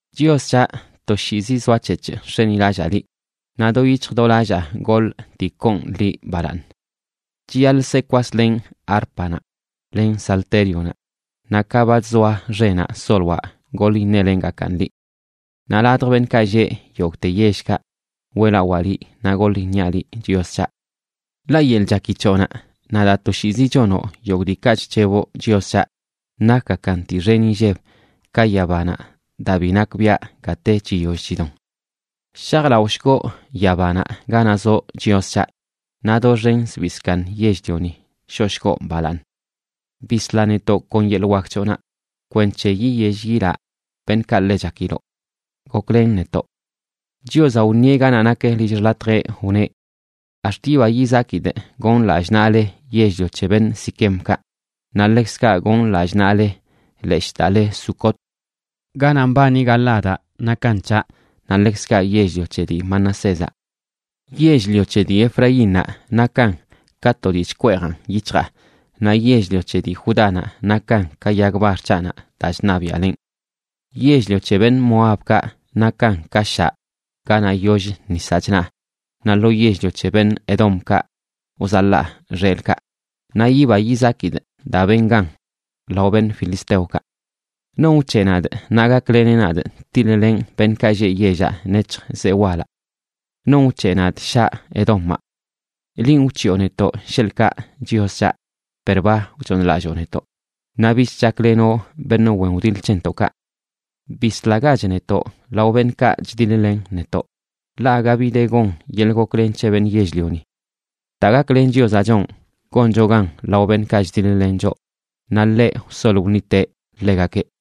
Chios c̱haꞌ, toshiizi zoac̱hec̱hꞌ nx̱enilallaa liꞌ, naꞌ do yic̱hj do lallaa goḻꞌ dii koon liꞌ balaaṉ. Chiyaḻꞌ se kwaslenꞌ árpanaꞌ len saltérionaꞌ naꞌ ka ba chzoa xenaꞌ, soloaꞌ goḻ iṉelengakaꞌn liꞌ. Naꞌ ladj beṉꞌkaꞌ lleꞌ yogꞌte yellkaꞌ weꞌlawaa liꞌ naꞌ goḻ iṉiaꞌ liꞌ, Chios c̱haꞌ. Ḻaꞌ yeḻꞌ chaki c̱hoꞌnaꞌ naꞌ daa toshiizi chonoꞌ yogꞌ diikaꞌ chc̱heboꞌ, Chios c̱haꞌ, nakgakan dii xen inlleb ka yabanaꞌ daa bi nakbiaꞌ gate chiyoll chidon. ¡Shajlaꞌoshgoꞌ yabanaꞌ ganaꞌ zoꞌ, Chios c̱haꞌ! Naꞌ ¡Doxen zbii zkaaṉ yell-lioni shoꞌshgoꞌ balaaṉ! Bisla netoꞌ kon yeḻꞌ wak c̱hoꞌnaꞌ kwenc̱he yiyell yilaꞌ beṉꞌkaꞌ ḻe chakiloꞌ. ¡Goklen netoꞌ! Chiozaꞌ wṉieꞌ ganaꞌ nak lill xḻatjeꞌ, wneꞌ: “Ax̱t yiba yizakidꞌ gonꞌ lallꞌ naꞌle yell-lio c̱he beṉꞌ Siquemkaꞌ, naꞌ ḻekzkaꞌ gonꞌ lallꞌ naꞌle leshꞌ daa le Sucot. Ganaꞌ mbani Galaadaꞌ nakan c̱haꞌ, naꞌ ḻekzkaꞌ yell-lio c̱he dii Manasézaꞌ. Yell-lio c̱he dii Efraínnaꞌ nakan ka to dii chkweejan yic̱hjaa, naꞌ yell-lio c̱he dii Judánaꞌ nakan ka yag bar c̱haꞌnaꞌ daa chṉabiaꞌlenꞌ. Yell-lio c̱he beṉꞌ Moabkaꞌ nakan ka shaꞌ ganaꞌ yoll nisaꞌ chnaa, naꞌ lo yell-lio c̱he beṉꞌ Edomkaꞌ wzaḻaa xelꞌkaꞌ, naꞌ yiba yizakidꞌ daa benꞌ gan lao beṉꞌ filisteokaꞌ.” ¿Non wc̱heꞌ nadꞌ naꞌ gakleneꞌ nadꞌ tiḻ-lenꞌ beṉꞌkaꞌ lleꞌ yellaꞌ nec̱hj zee walaꞌ? ¿Non wc̱heꞌ nadꞌ shaꞌ Edomaꞌ? Linꞌ wc̱hiꞌo netoꞌ, sheḻꞌkaꞌ Chios c̱haꞌ, per ba wchooṉlalloo netoꞌ, naꞌ bich chaklenoꞌ beṉꞌ wen wdiḻ c̱hentoꞌkaꞌ. Bislagach netoꞌ lao beṉꞌkaꞌ chdiḻ-len netoꞌ, ḻaꞌ aga bi de gon yeḻꞌ goklen c̱he beṉꞌ yell-lioni. Daa gaklen Chiozaꞌ chonꞌ goncho gan lao beṉꞌkaꞌ chdiḻ-len choꞌ, naꞌ ḻeꞌ wsol wṉiteꞌ ḻegakeꞌ.